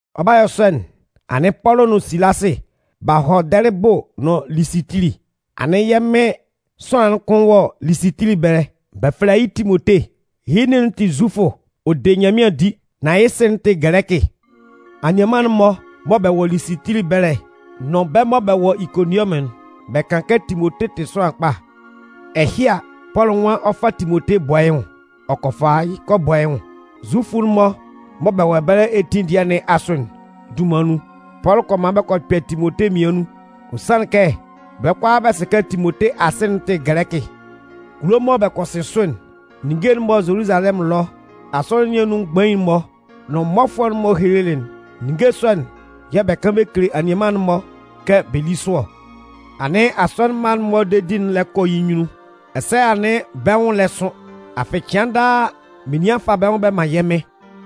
Ɔ 'ba yɔ sɔ'n, anɩn Pɔlʋ nʋn Silasɩ b'a hɔ Dɛlɩbʋ nʋn Lisitili. Anɩn yɛ́ Mɩn sʋanlan'n kʋn wɔ Lisitili ɛbɛlɛ. Bɛ fɛlɛ yɩ́ Timote. Yɩ́ nin'n tɩ Zufʋ, ɔ de Nyanmɩan di. Nan yɩ́ sɩ'n tɩ Gɛlɛkɩ. Anianman'n-mɔ mɔ bɛ wɔ Lisitili ɛbɛlɛ nʋn bɛ́ mɔ bɛ wɔ Ikoninwɔmʋn'n, bɛ kan kɛ Timote tɩ sʋanlan kpa. Ɛhɩ a, Pɔlʋ nwan ɔ 'fa Timote bɔ yɩ́ nwʋn. Ɔ kɔ fa yɩ́ kɔ bɔ yɩ́ nwʋn. Zufʋ'n-mɔ mɔ bɛ wɔ ɛbɛlɛ etin dɩɛ nɩn asʋ'n dunman nun, Pɔlʋ kɔ man bɛ kɔ kpɛ Timote mmian nun. Ɔ sanlɩn kɛ bɛ́ kʋalaa bɛ sɩ kɛ Timote asɩ'n tɩ Gɛlɛkɩ. Kulo mɔ bɛ kɔ sɩn sʋ'n, ninnge'n mɔ Zoluzalɛmʋn ɛlɔ asɔnɩn nɩn asʋ mgbain'n-mɔ nʋn mmɔfʋɛ'n-mɔ helelɩ'n, ninnge sɔ'n yɛ̂ bɛ kan bɛ kele anianman'n-mɔ kɛ bɛ lí sʋ ɔ. Anɩn asɔnɩn mma'n-mɔ dedi'n lɛ kɔ yɩ́ nyunnun, ɛsɛ anɩn bɛ́ nwʋn lɛ sʋn. Afɩ cɩan daa menian fa bɛ́ nwʋn bɛ man yɛ́ Mɩn.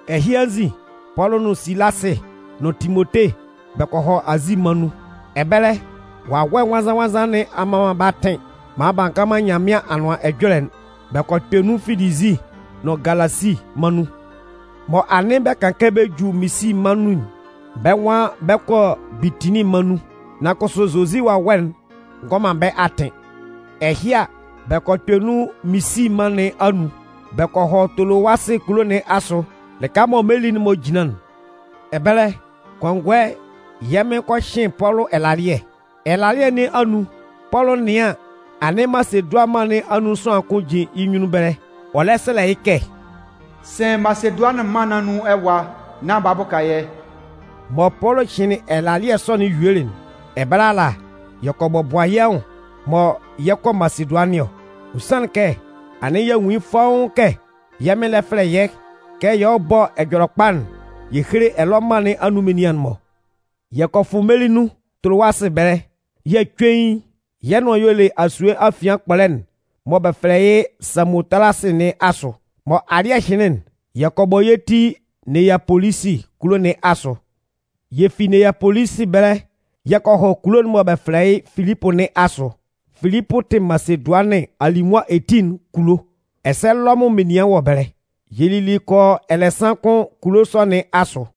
Ɛhɩ anzin, Pɔlʋ nʋn Silasɩ nʋn Timote bɛ kɔ hɔ Azi mân nun. Ɛbɛlɛ, Wawɛ Nwannzan-nwannzan nɩn a mman man bɛ́ atɩn maan b'a ngan man Nyanmɩan Anʋan Ɛjɔlɛ'n. Bɛ kɔ kpɛ nun Filizi nʋn Galasi mân nun. Mɔ anɩn bɛ ka kaan bɛ ju Misi mân nun'n, bɛ́ nwan bɛ 'kɔ Bitinin mân nun. Nan kʋsʋ Zozi Wawɛ'n ngɔ man bɛ́ atɩn. Ɛhɩ a, bɛ kɔ kpɛ nun Misi mân nɩn anun, bɛ kɔ hɔ Tolowasɩ kulo nɩn asʋ lɩka mɔ meli'n-mɔ jinlan'n. Ɛbɛlɛ, kɔngɔɛ, yɛ́ Mɩn kɔ hɩn Pɔlʋ ɛlalɩɛ. Ɛlalɩɛ nɩn anun, Pɔlʋ 'nɩan an, anɩn Masedʋanɩn mân nɩn anun sʋanlan kʋn jin yɩ́ nyunnun ɛbɛlɛ, ɔ lɛ sɛlɛ yɩ́ kɛ: “Sɩn Masedʋanɩn mân nɩn anun ɛwa nán bala bʋka yɛ́!” Mɔ Pɔlʋ hɩnlɩn ɛlalɩɛ sɔ'n yuelɩ'n, ɛbɛlɛ ala, yɛ kɔ bɔbʋa yɛ́ nwʋn mɔ yɛ 'kɔ Masedʋanɩn ɔ. Ɔ sanlɩn kɛ, anɩn y'a nwun yɩ́ fɔ́ʋ́n kɛ yɛ́ Mɩn lɛ fɛlɛ yɛ́ kɛ yɛ hɔ́ bɔ́ Ɛjɔlɛkpa'n yɛ héle ɛlɔ mân nɩn anun menian'n-mɔ. Yɛ kɔ fʋ meli nun Tolowasɩ ɛbɛlɛ yɛ̂ cuein, yɛ́ nʋan y'ɔ le asue afian kpɔlɛ'n mɔ bɛ fɛlɛ yɩ́ Samotalasɩ nɩn asʋ. Mɔ alɩ́ɛ hɩnlɩn'n, yɛ kɔ bɔ yɛ́ ti Neyapolisi kulo nɩn asʋ. Yɛ fi Neyapolisi ɛbɛlɛ yɛ kɔ hɔ kulo'n mɔ bɛ fɛlɛ yɩ́ Filipʋ nɩn asʋ. Filipʋ tɩ Masedʋanɩn alimʋa etin'n kulo, ɛsɛ Lɔmʋn menian wɔ ɛbɛlɛ. Yɛ lili kɔ yɔ ɛlɛsan kʋn kulo sɔ nɩn asʋ.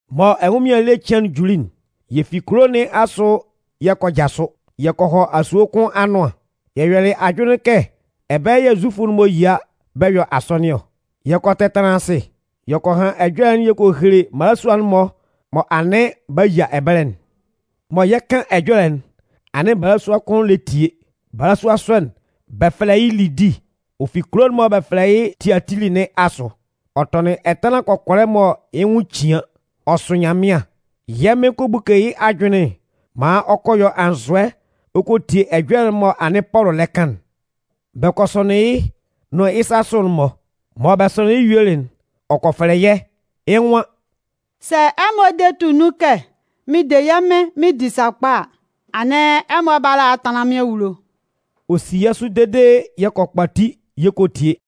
Mɔ ɛnwʋnmɩan ele cɩan'n juli'n, yɛ fi kulo nɩn asʋ yɛ kɔ jasʋ. Yɛ kɔ hɔ asue kʋn anʋan. Yɛ yɔlɩ ajʋnlɩn kɛ ɛbɛlɛ yɛ̂ Zufʋ'n-mɔ yia bɛ yɔ asɔnɩn ɔ. Yɛ kɔ tɛtanlan asɩ. Yɛ kɔ han ɛjɔlɛ'n yɛ kɔ hele mmalasua'n-mɔ mɔ anɩn b'a yia ɛbɛlɛ'n. Mɔ yɛ 'kan ɛjɔlɛ'n, anɩn balasua kʋn lɛ tie. Balasua sɔ'n, bɛ fɛlɛ yɩ́ Lidi. Ɔ fi kulo'n mɔ bɛ fɛlɛ yɩ́ Tiatili nɩn asʋ. Ɔ tɔnɩn ɛtanlan kɔkɔlɛ mɔ yɩ́ nwʋn cian. Ɔ sʋ Nyanmɩan. Yɛ́ Mɩn kɔ buke yɩ́ ajʋnlɩn maan ɔ kɔ yɔ anzʋɛ ɔ kɔ tie ɛjɔlɛ'n mɔ anɩn Pɔlʋ lɛ kan'n. Bɛ kɔ sɔnɩn yɩ́ nʋn yɩ́ sasʋ'n-mɔ. Mɔ bɛ sɔnɩnlɩn yɩ́ yuelɩ'n, ɔ kɔ fɛlɛ yɛ́, yɩ́ nwan: “Sɛ ɛmɔ de tʋ nun kɛ mɩn de yɛ́ Mɩn mɩn di sakpa a, anɩn ɛmɔ bála a tanlan mɩ́n awulo.” Ɔ si yɛ́ sʋ dede yɛ kɔ kpati yɛ kɔ tie.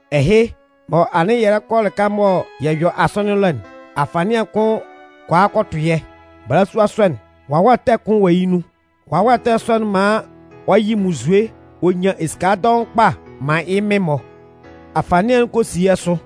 Ɛhɩ, mɔ anɩn yɛ lɛ kɔ lɩka mɔ yɛ yɔ asɔnɩn ɛlɔ'n, afanɩan kʋn kɔ a kɔ tʋ yɛ́. Balasua sɔ'n, wawɛ ɛtɛ kʋn wɔ yɩ́ nun. Wawɛ ɛtɛ sɔ'n man ɔ yɩ munnzue ɔ nyan esika dɔʋn kpa man yɩ́ mɩn-mɔ. Afanɩan'n kɔ si yɛ́ sʋ,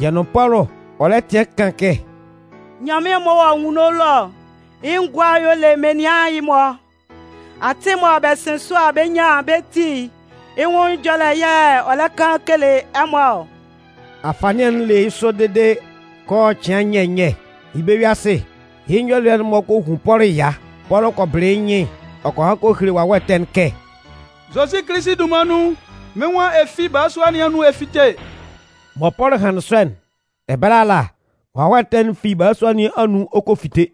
yɛ nʋn Pɔlʋ, ɔ lɛ tɩan kan kɛ: “Nyanmɩan'n m'ɔ wɔ anwunno ɛlɔ'n, yɩ́ ngʋa y'ɔ le menian ɛhɩ-mɔ. Atɩn'n mɔ bɛ sɩn sʋ a bɛ nyan bɛ́ ti'n, yɩ́ nwʋn ɛjɔlɛ yɛ̂ bɛ lɛ kan bɛ kele ɛmɔ ɔ!” Afanɩan'n le yɩ́ sɔ dede kɔ yɔ cɩan nyɛ nyɛ. Yɩ́ bɛ-yue-asɩɛ, yɩ́ nyɔlɩɛ'n kɔ hun Pɔlʋ ɛya. Pɔlʋ kɔ bɩlɩ yɩ́ nyɩn ɔ kɔ han kɔ hele wawɛ ɛtɛ'n kɛ: “Zozi Kilisi dunman nun, mɩ́n nwan ɛ fi balasua nɩn anun ɛ fíte!” Mɔ Pɔlʋ hanlɩn sɔ'n, ɛbɛlɛ ala, wawɛ ɛtɛ'n fi balasua nɩn anun ɔ kɔ fite.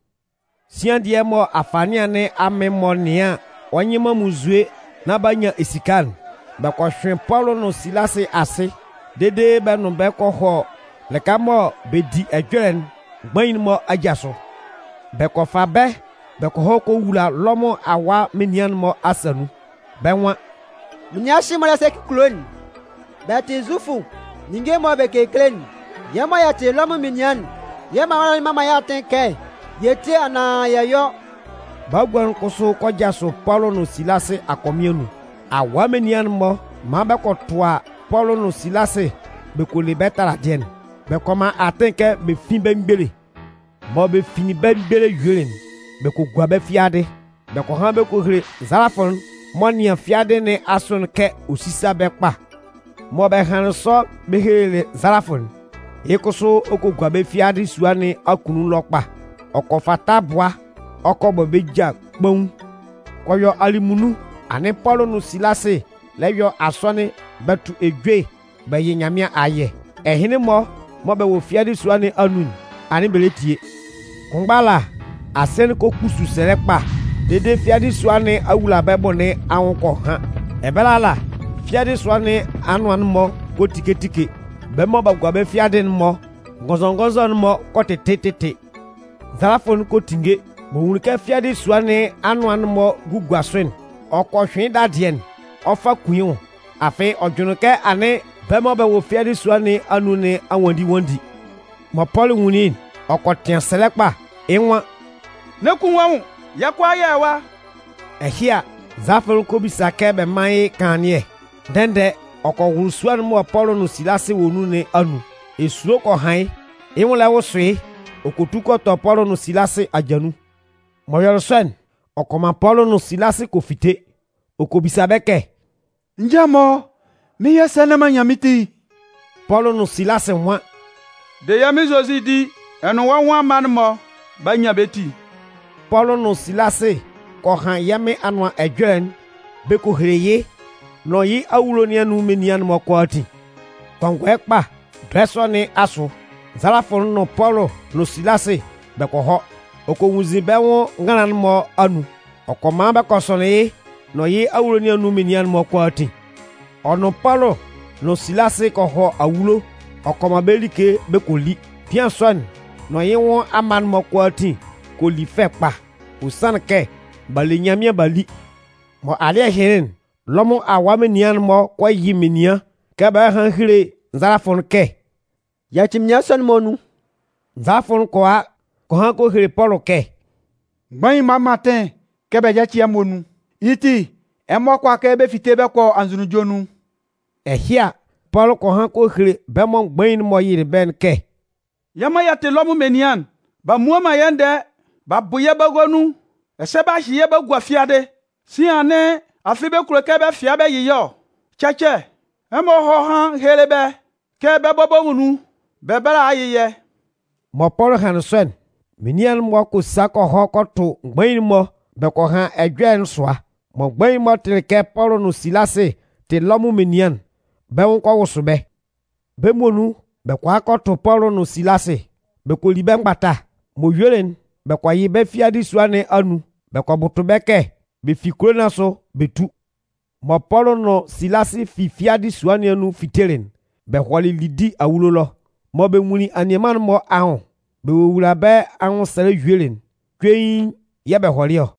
Sian dɩɛ mɔ afanɩan nɩn amɩn-mɔ nɩan an, ɔ nyɩ man munnzue nán b'a nyan esika'n, bɛ kɔ hyʋɩn Pɔlʋ nʋn Silasɩ asɩ dede bɛ nʋn bɛ́ kɔ hɔ lɩka mɔ bɛ di ɛjɔlɛ'n mgbain'n-mɔ aja sʋ. Bɛ kɔ fa bɛ́ bɛ kɔ hɔ kɔ wula Lɔmʋn awaa menian'n-mɔ asa nun. Bɛ́ nwan: “Menian ɛhɩ-mɔ lɛ sɛcɩ yɛ́ kulo'n. Bɛ tɩ Zufʋ, ninnge mɔ bɛ kekele'n, yɛ́ mɔ yɛ tɩ Lɔmʋn menian'n, yɛ́ mala'n mman man yɛ́ atɩn kɛ yɛ tíe anaan yɛ yɔ́.” Bagua'n kʋsʋ kɔ jasʋ Pɔlʋ nʋn Silasɩ akɔmɩn anun. Awaa menian'n-mɔ man bɛ kɔ tʋa Pɔlʋ nʋn Silasɩ bɛ kɔ le bɛ́ taladɩɛ'n. Bɛ kɔ man atɩn kɛ bɛ fín bɛ́ mgbele. Mɔ bɛ finlin bɛ́ mgbele yuelɩ'n, bɛ kɔ gua bɛ́ fiadɩ. Bɛ kɔ han bɛ kɔ hele nzalafʋ'n m'ɔ nɩan fiadɩ nɩn asʋ'n kɛ ɔ sísa bɛ́ kpa. Mɔ bɛ hanlɩn sɔ bɛ helelɩ nzalafʋ'n, yɩ́ kʋsʋ ɔ kɔ gua bɛ́ fiadɩ sua nɩn akunnun ɛlɔ kpa. Ɔ kɔ fa tabʋa ɔ kɔ bɔ bɛ́ ja kpaun. Kɔ yɔ alɩmunnun, anɩn Pɔlʋ nʋn Silasɩ lɛ yɔ asɔnɩn bɛ tʋ ejue bɛ yɩ Nyanmɩan ayɛ. Ɛhɩnlɩn-mɔ mɔ bɛ wɔ fiadɩ sua nɩn anun'n, anɩn bɛ lɛ tie. Kʋnmgba ala, asɩɛ'n kɔ kpusu sɛlɛ kpa dede fiadɩ sua nɩn awulabɛbʋ nɩn anwʋn kɔ han. Ɛbɛlɛ ala, fiadɩ sua nɩn anʋan'n-mɔ kɔ tike tike. Bɛ́ mɔ b'a gua bɛ́ fiadɩ'n-mɔ ngɔnzɔngɔnzɔ'n-mɔ kɔ tɩtɩ tɩtɩ. Nzalafʋ'n kɔ tinnge. M'ɔ nwunlin kɛ fiadɩ sua nɩn anʋan'n-mɔ gugua sʋ'n, ɔ kɔ hyʋɩn yɩ́ dadɩɛ'n, ɔ 'fa kun yɩ́ nwʋn. Afɩ ɔ jʋnlɩn kɛ anɩn bɛ́ mɔ bɛ wɔ fiadɩ sua nɩn anun nɩn a nwanndi nwanndi. Mɔ Pɔlʋ nwunlin yɩ́'n, ɔ kɔ tɩan sɛlɛ kpa, yɩ́ nwan: “N'ɛ kun wɔ́ nwʋn! Yɛ́ kʋalaa yɛ wɔ ɛwa!” Ɛhɩ a, nzalafʋ'n kɔ bisa kɛ bɛ mán yɩ́ kanlannɩɛ. Ndɛ-ndɛ, ɔ kɔ wʋlʋ sua'n mɔ Pɔlʋ nʋn Silasɩ wɔ nun nɩn anun. Esulo kɔ han yɩ́, yɩ́ nwʋn lɛ wʋsʋ yɩ́ ɔ kɔ tu kɔ tɔ Pɔlʋ nʋn Silasɩ aja nun. M'ɔ yɔlɩ sɔ'n, ɔ kɔ man Pɔlʋ nʋn Silasɩ kɔ fite. Ɔ kɔ bisa bɛ́ kɛ: “Nja-mɔ, mɩn 'yɔ sɛ nán m'an nyan mɩ́n ti!” Pɔlʋ nʋn Silasɩ nwan: “De yɛ́ Mɩn Zozi di, ɛ nʋn wɔ́ nwʋn amma'n-mɔ 'ba nyan bɛ́ ti.” Pɔlʋ nʋn Silasɩ kɔ han yɛ́ Mɩn Anʋan Ɛjɔlɛ'n bɛ kɔ hele yɩ́ nʋn yɩ́ awulo nɩn anun menian'n-mɔ kʋalaatin. Kɔngɔɛ kpa, dɔɛ sɔ nɩn asʋ, nzalafʋ'n nʋn Pɔlʋ nʋn Silasɩ bɛ kɔ hɔ, ɔ kɔ nwunnzin bɛ́ nwʋn nganlan'n-mɔ anun. Ɔ kɔ man bɛ kɔ sɔnɩn yɩ́ nʋn yɩ́ awulo nɩn anun menian'n-mɔ kʋalaatin. Ɔ nʋn Pɔlʋ nʋn Silasɩ kɔ hɔ awulo ɔ kɔ man bɛ́ like bɛ kɔ li. Bian sɔ'n nʋn yɩ́ nwʋn amma'n-mɔ kʋalaatin kɔ li fɛ kpa. Ɔ sanlɩn kɛ b'a le Nyanmɩan b'a li. Mɔ alɩ́ɛ hɩnlɩn'n, Lɔmʋn awaa menian'n-mɔ kɔ yɩ menian kɛ bɛ hɔ́ hán héle nzalafʋ'n kɛ: “Yaci menian sɔ'n-mɔ nun.” Nzalafʋ'n kɔ a kɔ han kɔ hele Pɔlʋ kɛ: “Mgbain'n-mɔ a man atɩn kɛ bɛ yáci ɛmɔ nun. Yɩ́ ti, ɛmɔ kʋala kɛ bɛ fite bɛ kɔ anzʋnunjɔ nun.” Ɛhɩ a, Pɔlʋ kɔ han kɔ hele bɛ́ mɔ mgbain'n-mɔ yɩlɩ bɛ́'n kɛ: “Yɛ́ mɔ yɛ tɩ Lɔmʋn menian'n, b'a mmua man yɛ́ ndɛɛ, b'a bʋ yɛ́ bagua nun ɛsɛ b'a hyɩ yɛ́ b'a gua fiadɩ! Sian anɩn afɩ bɛ kulo kɛ bɛ fɩa bɛ yɩ yɛ́ ɔ? Cɛcɛ! Ɛmɔ hɔ́ hán héle bɛ́ kɛ bɛ́ bɔbɔ muonun bɛ bála a yɩ yɛ́!” Mɔ Pɔlʋ hanlɩn sɔ'n, menian'n-mɔ kɔ sa kɔ hɔ kɔ tʋ mgbain'n-mɔ bɛ kɔ han ɛjɔlɛ'n sʋa. Mɔ mgbain'n-mɔ tɩlɩ kɛ Pɔlʋ nʋn Silasɩ tɩ Lɔmʋn menian'n, bɛ́ nwʋn kɔ wʋsʋ bɛ́. Bɛ́ muonun bɛ kɔ a kɔ tʋ Pɔlʋ nʋn Silasɩ. Bɛ kɔ li bɛ́ mgbata. M'ɔ yuelɩ'n, bɛ kɔ yɩ bɛ́ fi fiadɩ sua nɩn anun bɛ kɔ bʋtʋ bɛ́ kɛ bɛ fi kulo nɩn asʋ bɛ tú. Mɔ Pɔlʋ nʋn Silasɩ fi fiadɩ sua nɩn anun fitelɩ'n, bɛ hɔlɩ Lidi awulo ɛlɔ. Mɔ bɛ nwunlin anianman'n-mɔ anwʋn bɛ wowulalɩ bɛ́ anwʋnsɛlɛ yuelɩ'n, cuein yɛ̂ bɛ hɔlɩ ɔ.